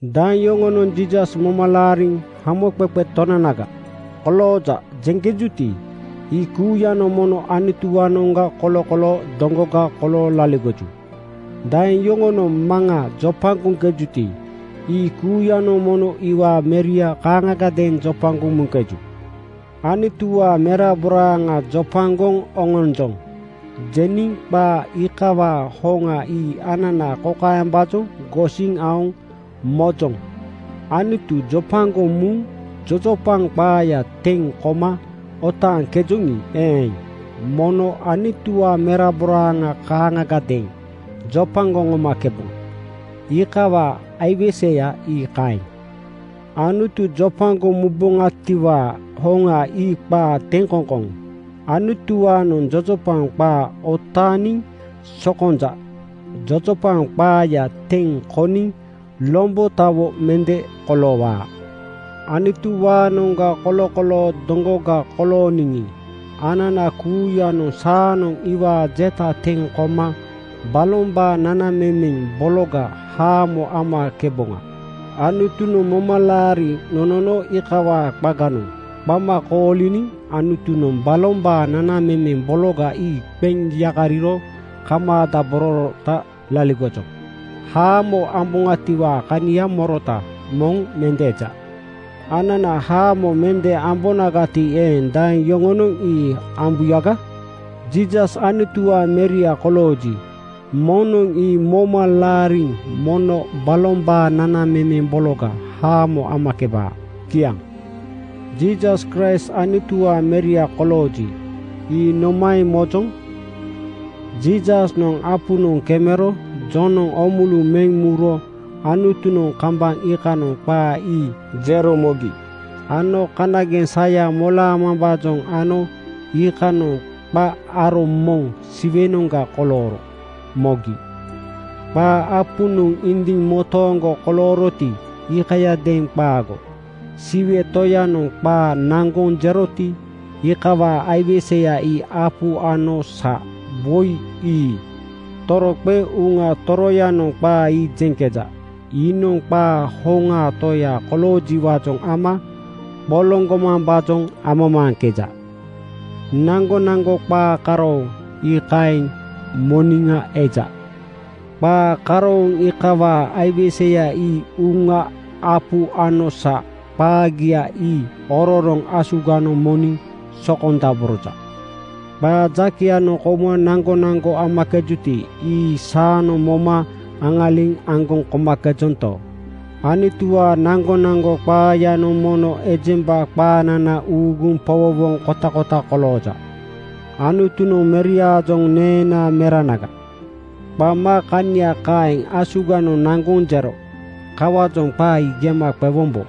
Daeŋ yoŋonoŋ Jiisas moma laariŋ “Hamoqeqe Tonanaga kolooja,” jeŋkejuti, ii kuuyanoŋ mono Anutuwaanoŋga kolokoloo doŋgoga kolooŋ laligoju. Daeŋ yoŋonoŋ Maŋa jopagoŋkejuti, ii kuuyanoŋ mono iwaa Meria kaaŋagadeeŋ jopagoŋ muŋkeju. “Anutuwaa meraboraaŋa jopagoŋ oŋonjoŋ,” jeniŋ qaa iikawaa hoŋa ii anana kokaembaajoŋ gosiŋ aoŋ mojoŋ: Anutu jopagoŋ muŋ jojopaŋ qaaya teŋ koma otaaŋkejoŋi eeŋ, mono Anutuwaa meraboraaŋa kaaŋagadeeŋ jopagoŋ oŋomakeboŋa. Iikawaa aiweseya ii kaeŋ. Anutu jopagoŋ muboŋatiwaa hoŋa ii qaa teŋkoŋkoŋ. Anutuwaanoŋ jojopaŋ qaa otaaniŋ sokonja. Jojopaŋ qaaya teŋ koniŋ lombotawo mende koloowaa. Anutuwaanoŋga kolokoloo doŋgoga kolooniŋi, anana kuuyanoŋ saanoŋ iwaa jeta teŋ koma balombaa nanamemeŋ bologa haamo amakeboŋa. Anutunoŋ momalaari nonono iikawaa qaganoŋ qama kooliniŋ Anutunoŋ balombaa nanamemeŋ bologa ii qeŋ yakariro kamaadabororota laligojoŋ. Haamo amboŋatiwaa kania morota moŋ mende eja. Anana haamo mende ambonagati eeŋ, daeŋ yoŋonoŋ ii ambuyaga? Jiisas Anutuwaa Meria kolooji, moŋnoŋ ii moma laariŋ mono balombaa nanamemeŋ bologa haamo amakebaa. Kiaŋ. Jiisas Kraist Anutuwaa Meria kolooji, ii nomaeŋ mojoŋ? Jiisasnoŋ apunoŋ kemero Jonoŋ oomulu meŋ muro Anutunoŋ kambaŋ iikanoŋ qaa ii jero mogi ano kanageŋ saya molaamambaajoŋ ano iikanoŋ qa aro moŋ Siwenoŋga kolooro mogi. Qaa apunoŋ indiŋ motooŋgo kolooroti, iikayadeeŋ qaago. Siwe Toyanoŋ qaa naŋgoŋ jeroti, iikawaa aiweseya ii apu ano sa, woi ii. Toroqeŋ Uŋa Toroyanoŋ qaa ii jeŋkeja. Iinoŋ qaa hoŋaa Toya koloojiwaajoŋ ama qoloŋgomambaajoŋ amamaaŋkeja. Naŋgonaŋgo qaa karooŋ ii kaeŋ moniŋa eja. Qaa karooŋ iikawaa aiweseya ii Uŋa, apu ano sa. Qaagia ii ororoŋ asuganoŋ moniŋ sokondaboroja. Qaa jakeyanoŋ kouma naŋgonaŋgo amakejuti, ii saanoŋ moma aŋaliŋ aŋgoŋ komakejonto, Anutuwaa naŋgonaŋgo qaayanoŋ mono ejemba qaanana uuguŋ powowoŋ kotakota kolooja. Anutunoŋ Meriaajoŋ “Neenaa Meranaga,” qama kania kaeŋ asuganoŋ naŋgoŋ jero. Kawaajoŋ qaa ii gema qewombo.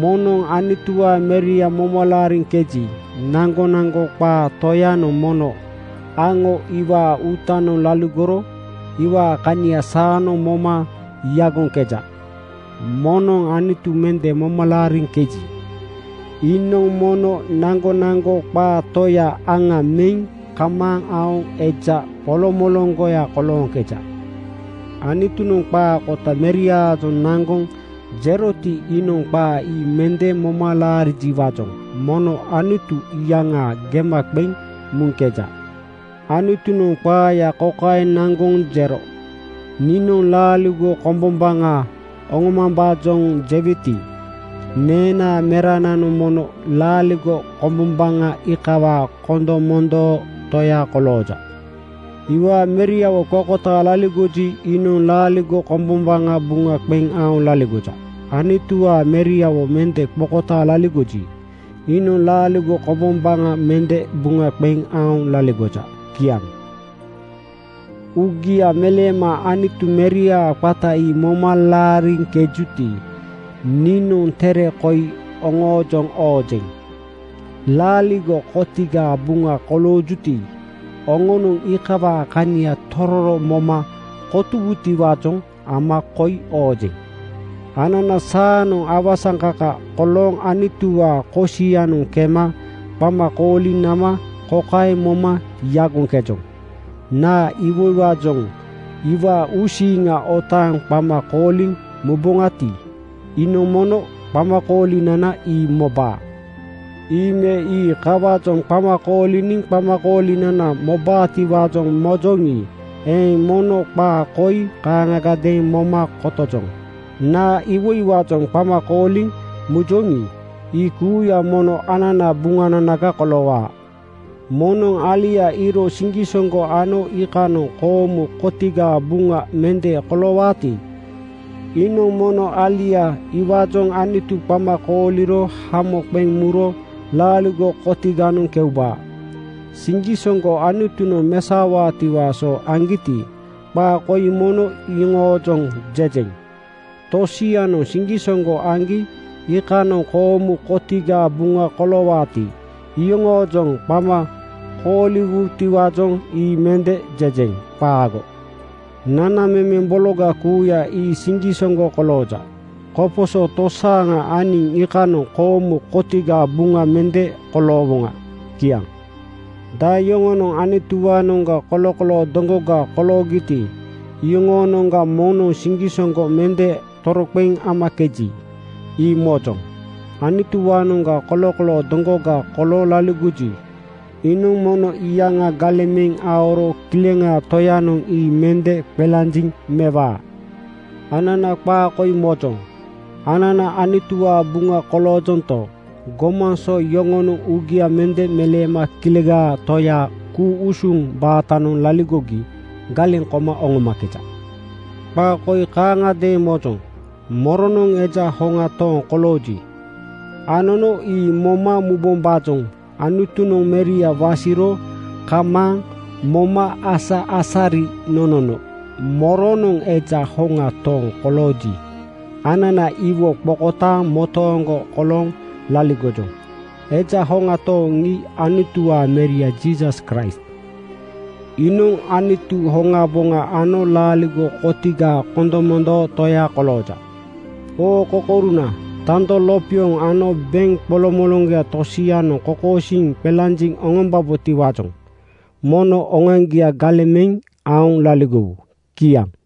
Moŋnoŋ Anutuwaa Meria moma laariŋkeji, naŋgonaŋgo qaa Toyanoŋ mono aŋo iwaa uutanoŋ laligoro iwaa kania saanoŋ moma yagoŋkeja. Moŋnoŋ Anutu mende moma laariŋkeji, iinoŋ mono naŋgonaŋgo qaa Toya aŋa meŋ kamaaŋ aoŋ eja qolomoloŋgoya kolooŋkeja. Anutunoŋ qaa kota Meriaajoŋ naŋgoŋ jeroti, iinoŋ qaa ii mende moma laarijiwaajoŋ mono Anutu iyaŋa gema qeŋ muŋkeja. Anutunoŋ qaaya kokaeŋ naŋgoŋ jero, “Niinoŋ laaligo kombombaŋa oŋomambaajoŋ jeweti, neenaa Merananoŋ mono laaligo kombombaŋa iikawaa kondomondoo Toya kolooja.” Iwaa Meriawo qokotaaŋ laligoji, iinoŋ laaligo kombombaŋa buŋa qeŋ aoŋ laligoja. Anutuwaa Meriawo mende qokotaaŋ laligoji, iinoŋ laaligo kombombaŋa mende buŋa qeŋ aoŋ laligoja. Kiaŋ. Uugia meleema Anutu Meriaa qata ii moma laariŋkejuti, niinoŋ tere koi oŋoojoŋ oojeŋ. Laaligo kotigaa buŋa koloojuti, oŋonoŋ iikawaa kania tororo moma kotowutiwaajoŋ ama koi oojeŋ. Anana saanoŋ awasaŋkaka kolooŋ Anutuwaa kosianoŋ kema qama kooliŋ nama kokaeŋ moma yagoŋkejoŋ: Naa iwoiwaajoŋ iwaa uusiiŋa otaaŋ qama kooliŋ muboŋati, iinoŋ mono qamakoolinana ii mobaa. Ii me ii kawaajoŋ qama kooliniŋ qamakoolinana mobaatiwaajoŋ mojoŋi eeŋ, mono qaa koi kaaŋagadeeŋ moma kotojoŋ: Naa iwoiwaajoŋ qama kooliŋ mujoŋi, ii kuuya mono ananaa buŋananaga koloowaa. Moŋnoŋ alia iiro siŋgisoŋgo ano iikanoŋ koomu kotigaa buŋa mende koloowaati, iinoŋ mono alia iwaajoŋ Anutu qama kooliro hamo qeŋ muro laaligo kotiganoŋ keubaa. Siŋgisoŋgo Anutunoŋ mesaowaatiwaa so aŋgiti, qaa koi mono iyoŋoojoŋ jejeŋ. Tosianoŋ siŋgisoŋgo aŋgi iikanoŋ koomu kotigaa buŋa koloowuti, iyoŋoojoŋ qama kooliwutiwaajoŋ ii mende jejeŋ. Qaago. Nanamemeŋ bologa kuuya ii siŋgisoŋgo kolooja. Koposo tosaaŋa aniŋ iikanoŋ koomu kotigaa buŋa mende koloowoŋa. Kiaŋ. Daeŋ yoŋonoŋ Anutuwaanoŋga kolokoloo doŋgoga koloogiti, iyoŋoonoŋga moŋnoŋ siŋgisoŋgo mende toroqeŋ amakeji, ii mojoŋ. Anutuwaanoŋga kolokoloo doŋgoga kolooŋ laligoji, iinoŋ mono iyaŋa galeŋ meŋ aoro Kileŋaa Toyanoŋ ii mende qelanjiŋ mewaa. Anana qaa koi mojoŋ: Anana Anutuwaa buŋa koloojonto, gomaŋ so yoŋonoŋ uugia mende meleema Kilegaa Toyaa ku-usuŋ baatanoŋ laligogi galeŋ koma oŋomakeja. Qaa koi kaaŋagadeeŋ mojoŋ: Moronoŋ eja hoŋa tooŋ kolooji, anono ii moma mubombaajoŋ Anutunoŋ Meria wasiro kamaaŋ moma-asa-asari nonono. Moronoŋ eja hoŋa tooŋ kolooji, anana iwo qokotaaŋ motooŋgo kolooŋ laligojoŋ. Eja hoŋa tooŋ ii Anutuwaa Meria Jiisas Kraist. Iinoŋ Anutu hoŋaboŋa ano laaligo kotigaa kondomondoo Toya kolooja. Oo kokouruna, tando lopioŋ ano beŋ qoloŋmoloŋgoya tosianoŋ kokosiiŋ qelanjiŋ oŋombubotiwaajoŋ mono oŋoaŋgia galeŋ meŋ aoŋ laligowu. Kiaŋ.